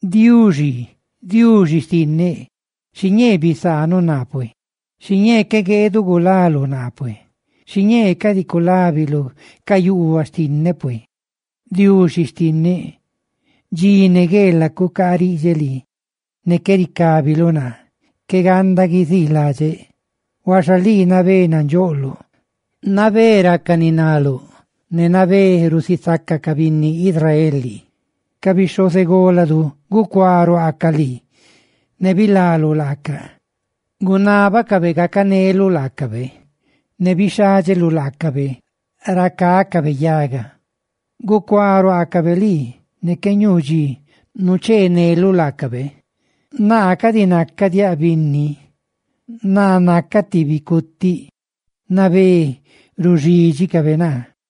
Diuxi xtinneꞌ, Diuxi xtinneꞌ, xiñee bisaanuꞌ naa pue, xiñee qué gueeduꞌ gulaluꞌ naa pue, xiñee cadi culábiluꞌ ca yuubaꞌ xtinneꞌ pue. Diuxi xtinneꞌ, dxi ne gueelaꞌ cucaariꞌdxeꞌ lii, ne qué ricábiluꞌ naa; ¡qué ganda guiziiladxeꞌ! Huaxa lii nabé nandxoꞌloꞌ; nabé raca ni naluꞌ ne nabé rusisaca ca binni Israel lii. Ca bixhozególadu gucuá ruaacaꞌ lii; ne runi nga bilaluꞌ laaca; gunábacabe gacaneluꞌ laacabe ne bixhádxeluꞌ laacabe ra cácabe yaga; gucuá ruaacabe lii ne qué ñuu dxi nucheeneluꞌ laacabe. Naa cadi nacaꞌ diaꞌ binni, naa nacaꞌ ti bicutiꞌ; ¡nabé ruxídxicabe naa!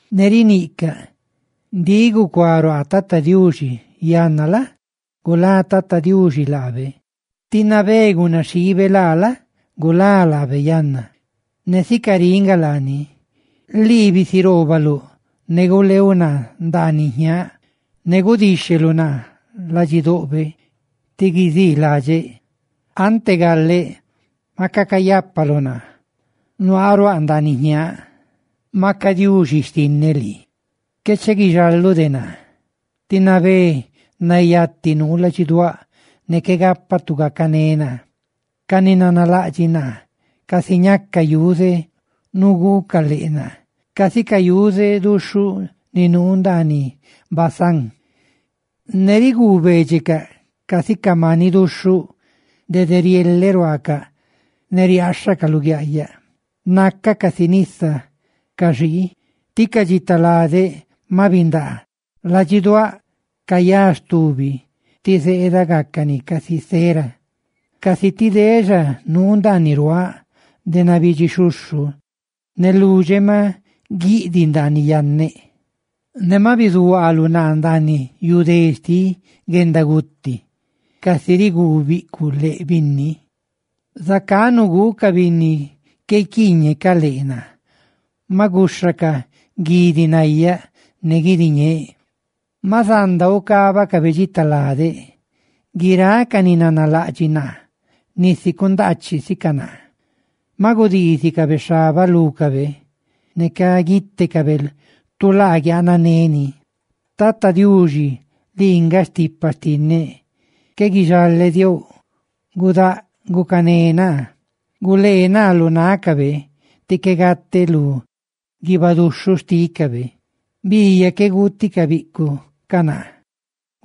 ne riniꞌcaꞌ: «Ndiꞌ gucuá ruaa Tata Diuxi; yanna la? gulá Tata Diuxi laabe tí nabé gunaxiibe laa la? gulá laabe yanna.» Ne sica riꞌ nga laani: lii bisiroobaluꞌ ne guleeuꞌ naa ndaaniꞌ jñaaꞌ; ne gudíxheluꞌ naa ladxidoꞌbe tí guiziiladxeꞌ. Ante galeꞌ, maca cayápaluꞌ naa; nuaa ruaꞌ ndaaniꞌ jñaaꞌ, maca Diuxi xtinneꞌ lii. Qué chi guixaluꞌ de naa, tí nabé nayati nuu ladxiduáꞌ, ne qué gapaꞌ tu gacané naa. Ca ni nanalaꞌdxiꞌ naa, casi ñacaꞌ yuze nuguucaꞌ leꞌ naa, casi ca yuze duxhuꞌ ni nuu ndaaniꞌ Basán; ne rigubeedxecaꞌ casi ca maniꞌ duxhuꞌ, dede rieleꞌ ruaacaꞌ ne riaaxhacaꞌ luguiaꞌyaꞌ. Nacaꞌ casi nisa caxii; tí ca dxita lade ma bindaa. Ladxiduáꞌ cayá stubi, tí zeeda gácani casi cera. Casi ti dexaa nuu ndaaniꞌ ruaaꞌ de nabidxi xhuxhu; ne ludxeꞌ ma guiꞌdiꞌ ndaaniꞌ yanneꞌ. ¡Ne ma bizuhuaaluꞌ naa ndaaniꞌ yu dé xtiꞌ guendaguti! Casi riguu biꞌcuꞌ leꞌ binni, zacá naguu ca binni qué guiquiiñe ca leꞌ naa, ma guxhacaꞌ guidi nayá ne guidi ñeeꞌ. ¡Ma zanda ugaabaꞌ dxita lade! Guiráꞌ ca ni nanalaꞌdxiꞌ naa, nisi cundaachiꞌ sicaꞌ naa; ma gudiizicabe xhabaꞌ lúcabe, ne caguitecabe tu laa guianané ni. Tata Diuxi, lii nga stipa xtinneꞌ, ¡qué guixale diouꞌ!, ¡gudáꞌ gucané naa! Gulee naa lu nácabe, tí qué gate lu guiibaꞌ duxhuꞌ xtícabe, biiyaꞌ qué guuti ca biꞌcuꞌ ca naa,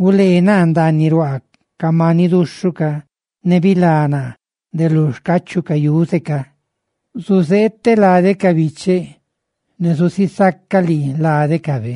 gulee naa ndaaniꞌ ruaa ca maniꞌ duxhuꞌ ca, ¡ne bilá naa de lu xcachuꞌ ca yuze ca! Zuzeeteꞌ láluꞌ lade ca bicheꞌ, ne zusisaca lii ládecabe.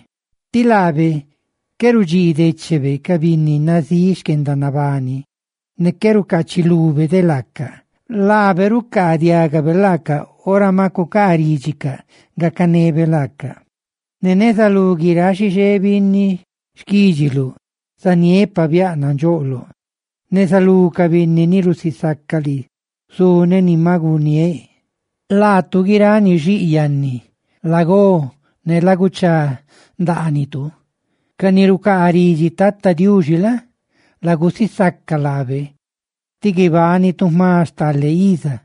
Tí laabe qué rudxii déchebe ca binni nazíꞌ xquendanabani, ne qué rucachilube de laaca. ¡Laabe rucaadiagabe laaca ora ma cucaaridxicaꞌ gacanebe laaca! Ne neza lú guiráꞌ xixé binni xquídxiluꞌ zaniéꞌ pabiáꞌ nandxoꞌloꞌ; neza lú ca binni ni rusisaca lii, zuneꞌ ni ma guniéꞌ. Laatu guiráꞌ ni xiꞌ yannitu, lagó, ne laguchá ndaanitu; ca ni rucaa ridxi Tata Diuxi la? lagusisaca laabe, tí guibanitu jma stale iza.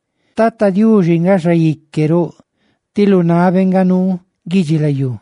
Tata Diuxi nga Xaique roꞌ, tí lu nabé nga nuu guidxilayú.